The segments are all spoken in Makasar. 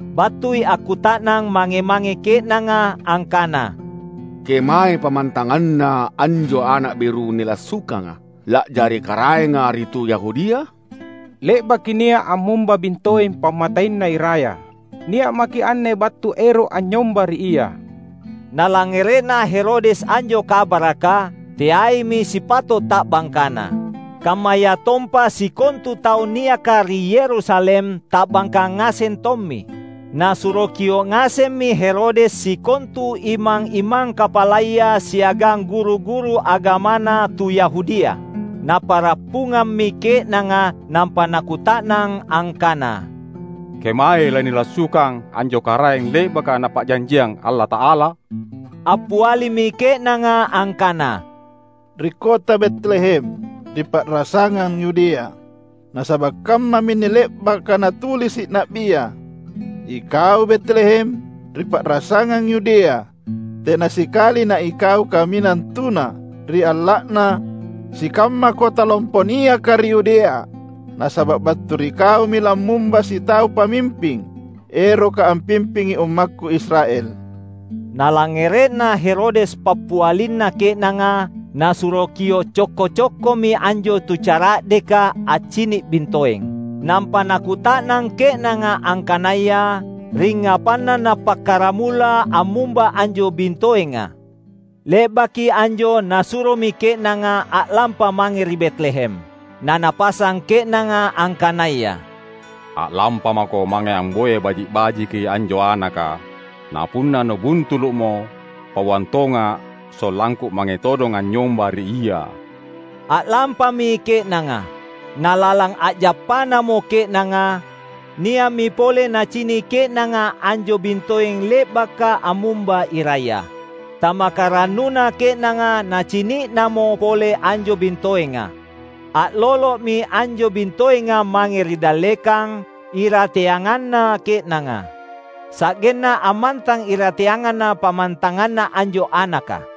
Battui akkuta’nang mange-mange ke’nanga angkana, "Kemae pammantanganna anjo Ana’ beru nilassukanga, la’jari karaenga ri tu Yahudia? Le’baki nia’ ammumba bintoeng pammateiNa iraya. Nia’ maki’ anne battu ero’ anynyomba ri Ia." Nalangngere’na Herodes anjo kabaraka, teaimi sipato’ ta’bangkana. Kammayatompa sikontu tau niaka ri Yerusalem ta’bangka ngaseng tommi. Nasuro kio’ ngasemmi Herodes sikontu imang-imang kapalaya siagang guru-guru agamana tu Yahudia. Napa’rappungammi ke’nanga nampa nakuta’nang angkana, "Kemae lanilassukang anjo Karaeng le’baka Napa’janjiang Allata’ala?" Appialimi ke’nanga angkana, "Ri kota Betlehem, ri pa’rasangang Yudea. Nasaba’ kammaminne le’baka natulisi’ na’bia, ‘Ikau Betlehem, ri pa’rasangang Yudea, Tena sikali naikau kaminang tuna ri alla’na sikamma kota lompo niaka ri Yudea, Nasaba’ battu ri kaumi lammumba sitau pamimping eroka ampimpingi ummakKu Israel.’" Nalangngere’na Herodes pappialina ke’nanga, nasuro kio’ cokko-cokkomi anjo tucara’deka accini’ bintoeng. Nampa nakuta’nang ke’nanga angkanaya ringngapanna nappakkaramula ammumba anjo bintoenga. Le’baki anjo nasuromi ke’nanga a’lampa mange ri Betlehem. Na napasang ke’nanga angkanaya, "A’lampamako mange amboya baji’-bajiki anjo Anaka. Napunna nubuntulu’mo, pauang tonga’, sollangku mange todong anynyomba ri ia." A’lampami ke’nanga. Nalalang a’jappanamo ke’nanga, nia’mi pole nacini’ ke’nanga anjo bintoeng le’baka ammumba iraya. Tamaka rannuna ke’nanga nacini’namo pole anjo bintoenga. A’lolo’mi anjo bintoenga mange ri dallekang, irateanganna ke’nanga. Sa’genna ammantang irateanganna pammantanganna anjo Anaka.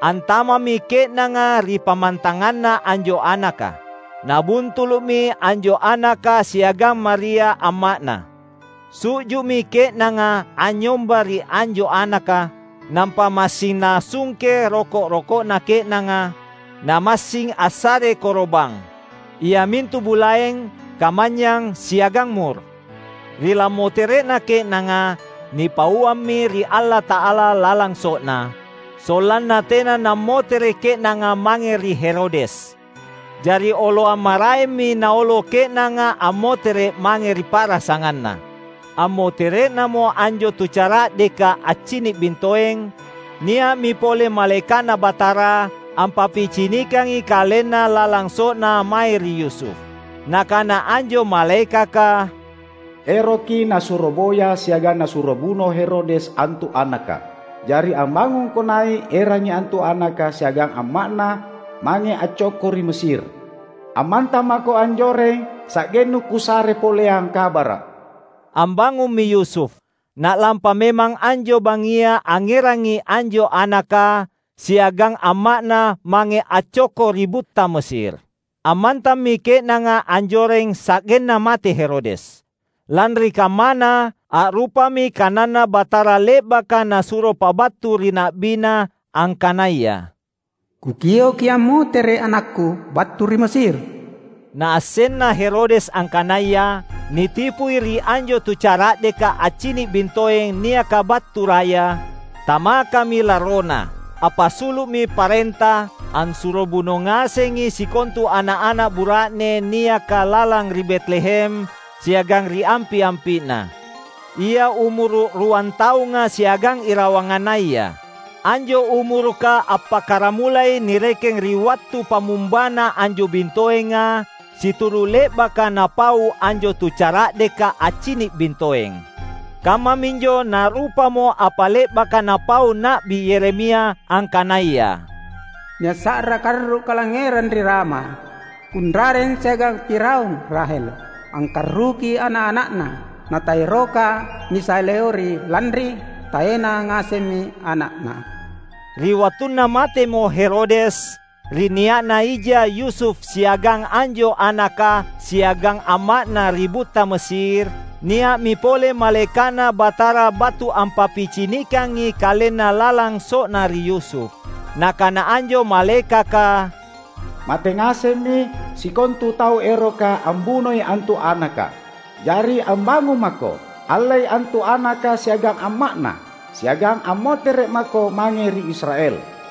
Antama’mi ke’nanga ri pammantanganna anjo Anaka. Nabuntulu’mi anjo Anaka siagang Maria amma’Na. Su’ju’mi ke’nanga anynyomba ri anjo Anaka. Nampa massing nasungke roko’-roko’na ke’nanga, namassing assare koro’bang, iamintu bulaeng, kamanynyang, siagang mur. Ri lammotere’na ke’nanga, nipauammi ri Allata’ala lalang so’na, sollanna tea ammoteri ke’nanga mange ri Herodes. Jari oloang maraemmi naolo ke’nanga ammotere’ mange ri pa’rasanganna. Ammotere’namo anjo tucara’deka accini’ bintoeng, nia’mi pole malaeka’Na Batara ampappicinikangi kalenna lalang so’na mae ri Yusuf. Nakana anjo malaekaka, "Eroki nasuro boya siagang nasuro buno Herodes antu Anaka. Jari ambangungko nai’, erangi antu Anaka siagang amma’Na mange accokko ri Mesir. Ammantang mako anjoreng sa’gennu Kusare poleang kabara’." Ambangummi Yusuf, na’lampa memang anjo bangngia angngerangi anjo Anaka siagang amma’Na mange accokko ri butta Mesir. Ammantammi ke’nanga anjoreng sa’genna mate Herodes. Lanri kammana, a’rupami kananNa Batara le’baka Nasuro pabattu ri na’biNa, angkanaya, "Kukioki ammotere’ anakKu battu ri Mesir." Naassenna Herodes angkanaya nitipui ri anjo tucara’deka accini’ bintoeng niaka battu raya, tamakami larrona. Appasulu’mi parenta, assuro buno ngasengi sikontu ana’-ana’ bura’ne niaka lalang ri Betlehem siagang ri ampi’-ampi’na, ia umuru’ ruan taunga siagang irawangannaya. Anjo umuruka appakkaramulai nirekeng ri wattu pammumbana anjo bintoenga, situru’ le’baka napau anjo tucara’deka accini’ bintoeng. Kammaminjo na’rupamo apa le’baka napau Na’bi Yeremia, angkanaya, "Nia’ sa’ra karru’ kalangngerang ri Rama Kunrareng siagang piraung Rahel angkarruki ana’-ana’na; na taeroka nisaleori lanri taena ngasemmi ana’na." Ri wattunna matemo Herodes, ri nia’na ija Yusuf siagang anjo Anaka siagang amma’Na ri butta Mesir, nia’mi pole malaeka’Na Batara battu ampappicinikangi kalenna lalang so’na ri Yusuf. Nakana anjo malaekaka, "Mate ngasemmi sikontu tau eroka ambunoi antu Anaka. Jari ambangung mako, allei antu Anaka siagang amma’Na siagang ammotere’ mako mange ri Israel."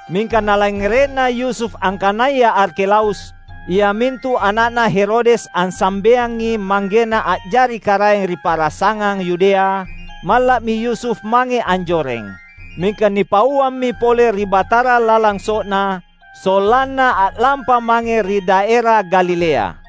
Mingka nalangngere’na Yusuf angkanaya Arkelaus, iamintu ana’na Herodes ansambeangi manggena a’jari karaeng ri pa’rasangang Yudea, malla’mi Yusuf mange anjoreng. Mingka nipauammi pole ri Batara lalang so’na, sollanna a’lampa mange ri Daera Galilea.